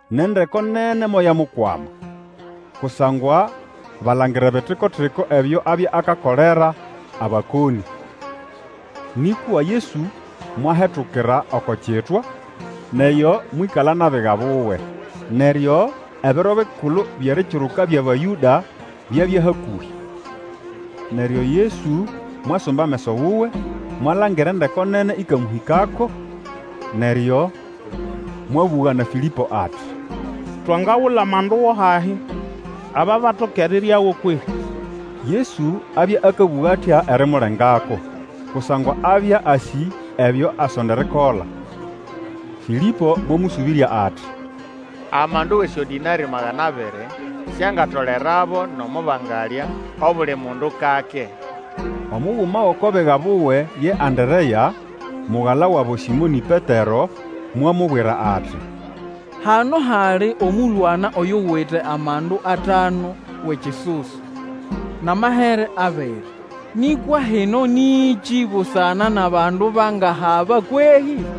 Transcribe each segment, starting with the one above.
Nʼendeko nene moyamukwama, kusangwa balangira ebitiko-tiko ebyo abya akakolera abakonĩ. Nĩkwa Yesu mwahetukira oko kitwa, nʼeyo mwĩkala nʼabiga buwe. Neryo Ebiro Bikulu byʼErikiruka byʼAbayũda byabya hakũhĩ. Neryo Yesu mwasumba ameso wuwe, mwalangira endeko nene ĩkamũhĩkako, neryo mwabũga na Fĩlĩpo ati, Twangagula amandu go hahi, aba batoke eriryago kwehĩ? Yesu abya akabũga atya erimulengako; kusangwa abya asĩ ebyo asonda erikola. Fĩlĩpo mwamũsũbĩrya ati, Amandu wʼesyodĩnarĩ magana abiri siangatolerabo nomo bangalya obuli mundu kake. Omuguma wʼoko biga buwe ye Anderea, mugala wabo Sĩmonĩ Petero, mwamubwira ati. Hano hali omũlwana oyuwite amandu atanu wʼekisusu, nʼamahere abiri, nĩkwa hino nĩkĩ busana nʼabandu bangahaba kwehĩ?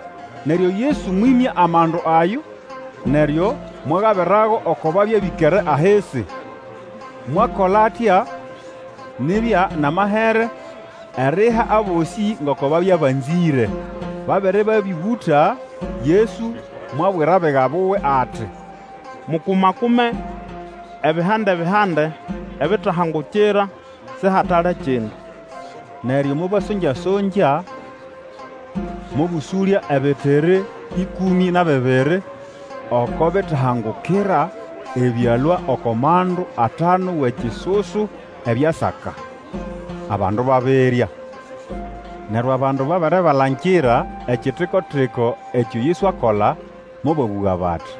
Neryo Yesu mwĩmya amandu ayo, neryo mwagabirago oko babya bĩkere ahisi. Mwakola atya nibya nʼamahere eriha abosĩ ngoko babya banzĩre. Babere babĩũgũta, Yesu mwabwira abiga buwe ati, Mukuma-kume ebihandebihande ebitahangukira, sihatale kindu. Neryo mobasonga-songya, mobũsũlya ebitiri ĩkũmĩ na bibiri oko bitahangukira ebyalũa oko mandu atanu wʼekisusu ebyasaka, abandu babirya. Neryo abandu babere balangira ekitiko-tiko ekyo Yesu akola, mobabũga bati,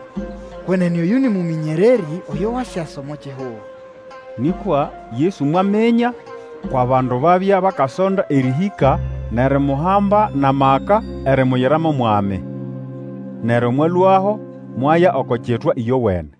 Kwenene oyũ nĩ Mũmĩnyererĩ oyo wasyasa omo kihugo! Nĩkwa Yesu mwaminya kwʼabandu babya bakasonda erĩhĩka nʼerimuhamba nʼamaka erimuyira mo mwami. Neryo mwalũaho mwaya oko kitwa ĩyowene.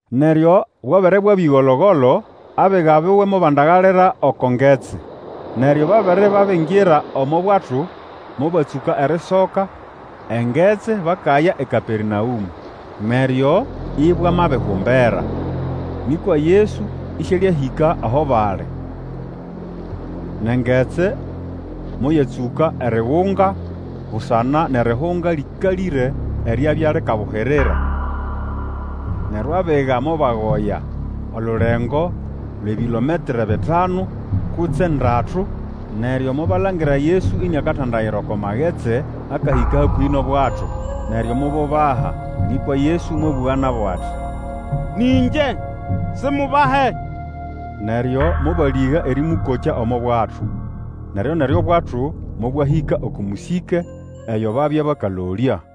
Neryo bwabere bwabya ĩgolo-golo abiga buwe mobandagalira oko ngetsi. Neryo babere babingira omo bwato, mobatsũka erisoka engetsi bakaya eKapernaũmũ. Neryo ibwamabihumbera, nĩkwa Yesu ĩsĩalĩahĩka aho bali. Nʼengetsi moyatsũka erigunga busana nʼerihunga lĩkalĩre eryabya likabuhirira. Neryo abiga mobagoya olulengo lwʼebilometre bitanu kutse ndatu, neryo mobalangira Yesu iniakatandayira oko magetsi akahĩka hakũhĩ nʼobwato; neryo mobubaha. Nĩkwa Yesu mwabũga nabo ati, Nĩ ĩngye, simubahe! Neryo mobalĩga erĩmũkokya omo bwato; neryoneryo obwato mobwahĩka oko mũsĩke eyo babya bakalolya.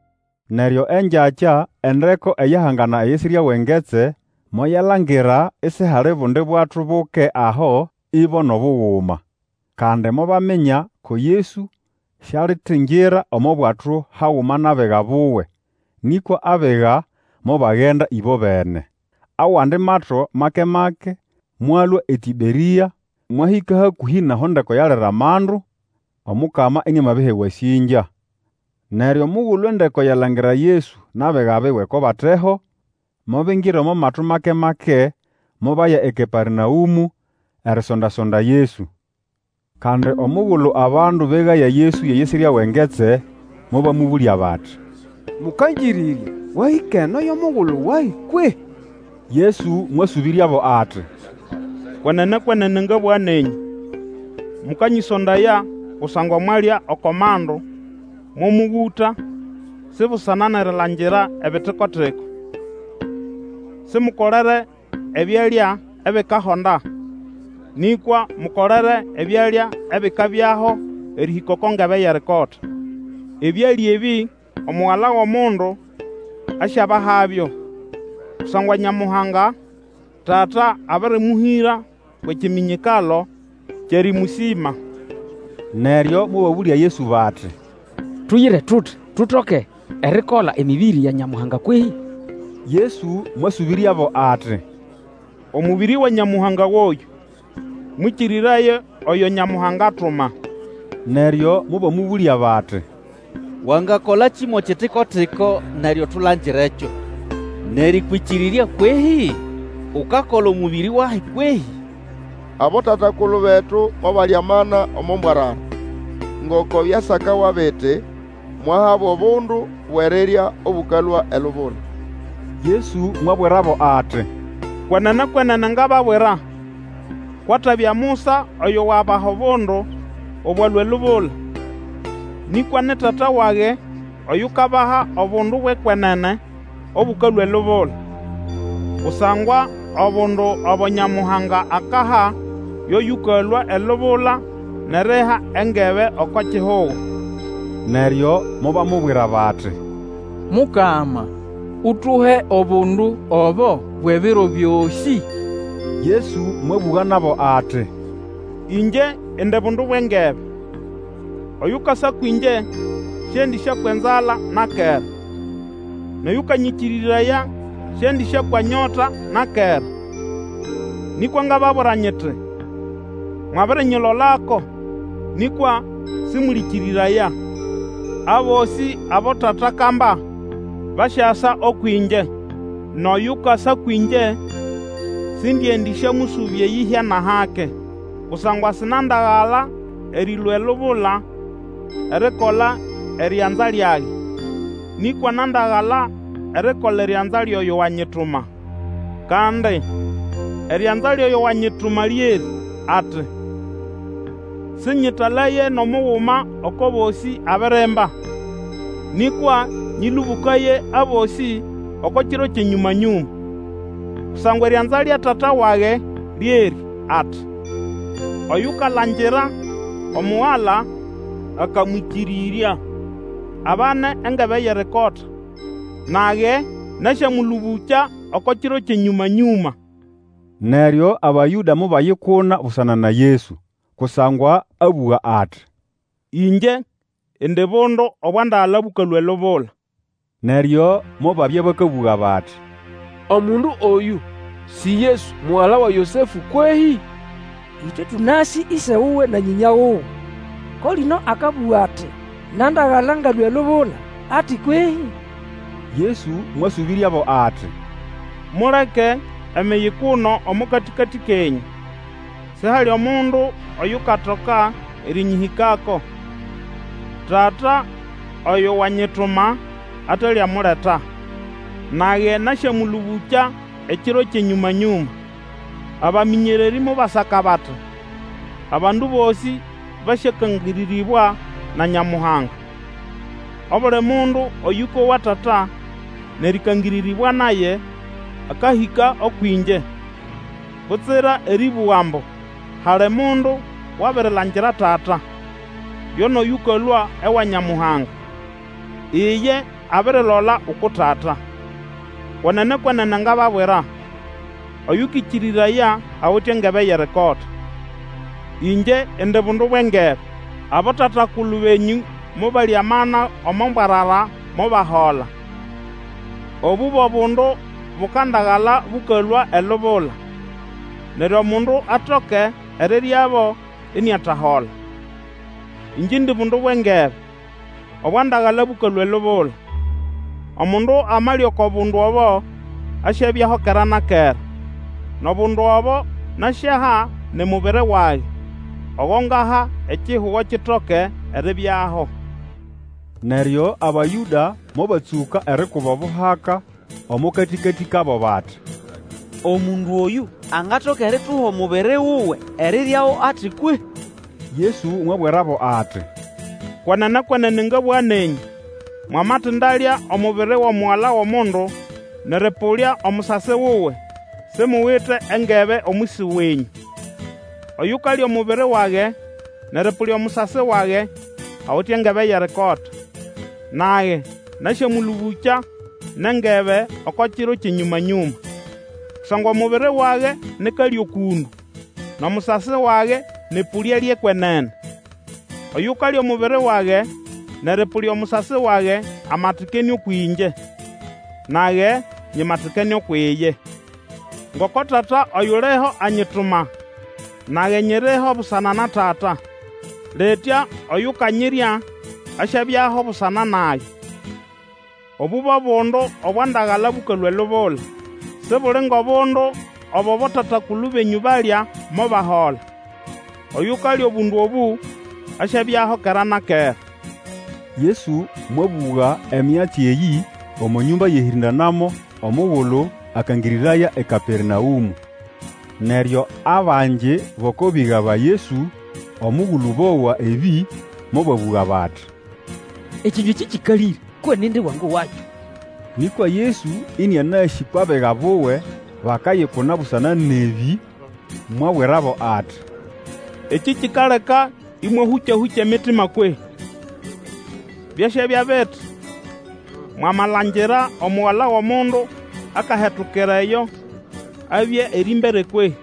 Neryo engyakya endeko eyahangana eyisirya wʼengetsi moyalangira isihali obundi bwato buke aho, ibo nʼobuguma. Kandi mobaminya ko Yesu sialitingira omo bwato haguma nʼabiga buwe, nĩkwa abiga mobagenda ĩbobene. Awandi mato make-make mwalũa eTĩberĩa, mwahĩka hakũhĩ nʼaho endeko yalira amandu, Omukama iniamabiha ewasĩngya. Neryo omugulu endeko yalangira Yesu nʼabiga buwe ko bateho, mobingira omo mato make-make, mobaya eKapernaũmũ, erisonda-sonda Yesu. Kandi omugulu abandu begaya Yesu eyisirya wʼengetsi, mobamũbũlya bati, Mũkangĩrĩrya, wahĩka eno yo mugulu wahi kwehĩ? Yesu mwasũbĩryabo ati, Kwenene, kwenene ngabũga nenyũ, mukanyĩsondaya kusangwa mwalya oko mandu, momũgũta, si busana nʼerilangira ebitiko-tiko. Simukolere ebyalya ebikahonda, nĩkwa mukolere ebyalya ebikabyaho erĩhĩka oko ngebe yʼerikota. Ebyalya ebĩ Omugala wʼOmundu asyabahabyo, kusangwa Nyamuhanga, Tata, abĩrĩmũhĩra kwʼekiminyikalo kyʼerĩmũsĩma. Neryo mobabũlya Yesu bati, Tuyire tuti tutoke erikola emĩbĩrĩ ya Nyamuhanga kwehĩ? Yesu mwasũbĩryabo ati, Omũbĩrĩ wa Nyamuhanga goyũ: mwĩkĩrĩraye oyo Nyamuhanga atuma. Neryo mobamũbũlya bati, Wangakolakĩ mo kitiko-tiko neryo tulangirekyo, nerĩkwĩkĩrĩrya kwehĩ? Ukakola omũbĩrĩ wahi kwehĩ? Abotata-kulu betu mobalya amana omo mbwarara; ngoko byasakawa biti, Mwahabo obundu bwʼerirya obũkalũa elubula. Yesu mwabwirabo ati, Kwenene, kwenene ngababwira, kwʼatabya Musa oyo wabaha obundu obwalũa elubula; nĩkwa ni Tata wage oyukabaha obundu bwʼekwenene obũkalũa elubula. Kusangwa obundu obo Nyamuhanga akaha yo yũkalũa elubula nʼeriha engebe oko kihugo. Neryo mobamubwira bati, Mukama, utuhe obundu obo bwʼebiro byosĩ. Yesu mwabũga nabo ati, Ingye indi bundu bwʼengebe. Oyukasa kwĩngye sĩendĩsyakwa nzala na kera, nʼoyũkanyĩkĩrĩraya sĩendĩsyakwa nyota na kera. Nĩkwa ngababwira nyiti, Mwabirinyilolako, nĩkwa sĩmũlĩkĩrĩraya. Abosĩ abo Tata akamba basyasa ũkwʼĩngye; nʼoyukasa kwĩngye sindiendĩsyamũsũbya eyĩhya nʼahake. Kusangwa sinandagala erĩlũa elubula erikola erianza lyage, nĩkwa nandagala erikola erianza lyʼoyo wanyituma. Kandi erianza lyʼoyo wanyituma lyerĩ ati, sĩnyĩtalaye nʼomuguma oko bosĩ abirimba, nĩkwa nyĩlũbũkaye abosĩ oko kiro kyʼenyũmanyũma. Kusangwa erianza lya Tata wage lyerĩ ati, Oyukalangira Omugala, akamwĩkĩrĩrya, abane engebe yʼerikota; nage nasyamũlũbũkya oko kiro kyʼenyũma-nyũma. Neryo Abayũda mobayikuna busana na Yesu, kusangwa abũga ati, Ĩngye indi bundu obwandagala bũkalũa elubula. Neryo mobabya bakabũga bati, Omundu oyũ si Yesu, mugala wa Yosefũ kwehĩ? Ĩtwe tũnasĩ ĩse wuwe na nyĩnya wuwe. Ko lino akabũga ati, Nandagala ngalũa elubula, ati kwehĩ? Yesu mwasũbĩryabo ati, Muleke emiyikuno omo katĩkatĩ kenyũ. Sihali omundu oyukatoka erĩnyĩhĩkako, Tata oyo wanyituma ataliamuleta; nage nasyamũlũbũkya ekiro kyʼenyũma-nyũma. Abamĩnyererĩ mobasaka bati, Abandu bosĩ basyakangĩrĩrĩbwa na Nyamuhanga. Obuli mundu oyũkowa Tata nʼerĩkangĩrĩrĩbwa naye, akahĩka ũkwʼĩngye. Butsira erĩbũga ambu hali mundu wabirilangira Tata; yo nʼoyũkalũa ewa Nyamuhanga, Iye abirilola uku Tata. Kwenene, kwenene ngababwira, Oyũkĩkĩrĩraya awite engebe yʼerikota. Ĩngye indi bundu bwʼengebe. Abotata-kulu benyũ mobalya amana omo mbwarara, mobahola. Obũ bo bundu bukandagala bũkalũa elubula, neryo omundu atoke eriryabo, iniatahola. Ĩngye indi bundu bwʼengebe obwandagala bũkalũa elubula. Omundu amalya oko bundu obo, asyabyaho kera na kera; nʼobundu obo nasyaha ni mubiri wage, ogo ngaha, ekihugo kitoke eribyaho. Neryo Abayũda mobatsũka erikuba obuhaka omo katĩkatĩ kabo bati, Omundu oyũ angatoka erituha omubiri wuwe eriryago ati kwehĩ? Yesu mwabwirabo ati, Kwenene, kwenene ngabũga nenyũ, mwamatindalya omubiri wʼomugala wʼOmundu nʼerĩpũlya omusasi wuwe, simuwite engebe omwisi wenyũ. Oyukalya omubiri wage nʼerĩpũlya omusasi wage, awite engebe yʼerikota, nage nasyamũlũbũkya nʼengebe oko kiro kyʼenyũma-nyũma. Kusangwa omubiri wage ni kalyo kũndũ, nʼomusasi wage nĩ ʼpũlya lyʼekwenene. Oyukalya omubiri wage nʼerĩpũlya omusasi wage amatikene ũkwʼĩngye, nage nyimatikene ukwʼiye. Ngoko Tata oyuliho anyituma, nage nyiriho busana na Tata; litya oyukanyirya, asyabyaho busana nage. Obũ bo bundu obwandagala bũkalũa elubula; sibuli ngʼobundu obo abotata-kulu benyũ balya, mobahola. Oyukalya obundu obũ asyabyaho kera na kera. Yesu mwabũga enyatsi eyĩ omo nyũmba yʼerĩhĩndanamo omugulu akangĩrĩraya eKapernaũmũ. Neryo abangi bʼoko biga ba Yesu omugulu bowa ebĩ mobabũga bati, Ekĩnywa ekĩ kĩkalĩre; ko nindi wangowakyo. Nĩkwa Yesu, ĩnĩanasĩ kwʼabiga buwe bakayikuna busana nʼebĩ, mwabwirabo ati, Ekĩ kikaleka ĩmwahũka-hũkya emitima kwehĩ? Byasyabya biti, mwamalangira Omugala wʼOmundu akahetukira eyo abya erĩmbere kwehĩ?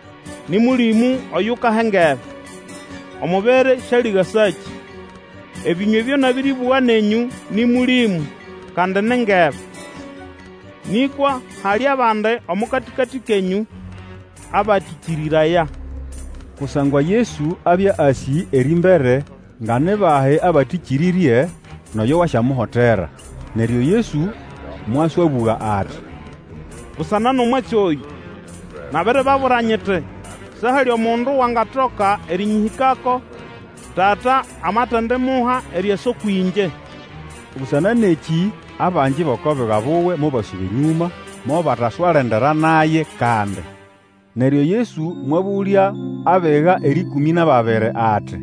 Nĩ Mũlĩmũ oyukaha engebe; omubiri sialigasakĩ. Ebĩnywa ebyo nabĩrĩbũga nenyũ nĩ Mũlĩmũ, kandi ni ngebe. Nĩkwa hali abandi omo katĩkatĩ kenyũ abatĩkĩrĩraya. Kusangwa Yesu abya asĩ erĩmbere nga ni bahi abatĩkĩrĩrye, nʼoyo wasyamuhotera. Neryo Yesu mwaswabũga ati, Busana nʼomwatsi oyũ, nabiribabwira nyiti sihali mundu wangatoka erĩnyĩhĩkako, Tata amatendimuha eriasa ũkwʼĩngye. Busana nʼekĩ, abangi bʼoko biga buwe mobasuba enyũma, mobataswalendera naye kandi. Neryo Yesu mwabũlya abiga erĩkũmĩ nʼababiri ati,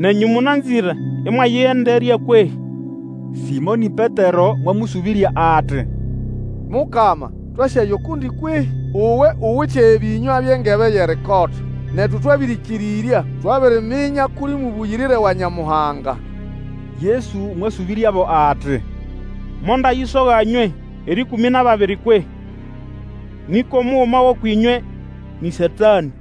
Nenyũ mũnanzĩre ĩmwayĩgenderya kwehĩ? Sĩmonĩ Petero mwamũsũbĩrya ati, Mukama, twasyaya ukundi kwehĩ? Uwe uwite ebĩnywa byʼengebe yʼerikota. Netu twabĩrĩkĩrĩrya twabiriminya kʼuli Mũbũyĩrĩre wa Nyamuhanga. Yesu mwasũbĩryabo ati, Mondayisoga nywe, erĩkũmĩ nʼababiri, kwehĩ? Nĩkwa omuguma gʼũkwʼĩnywe nĩ Satanĩ.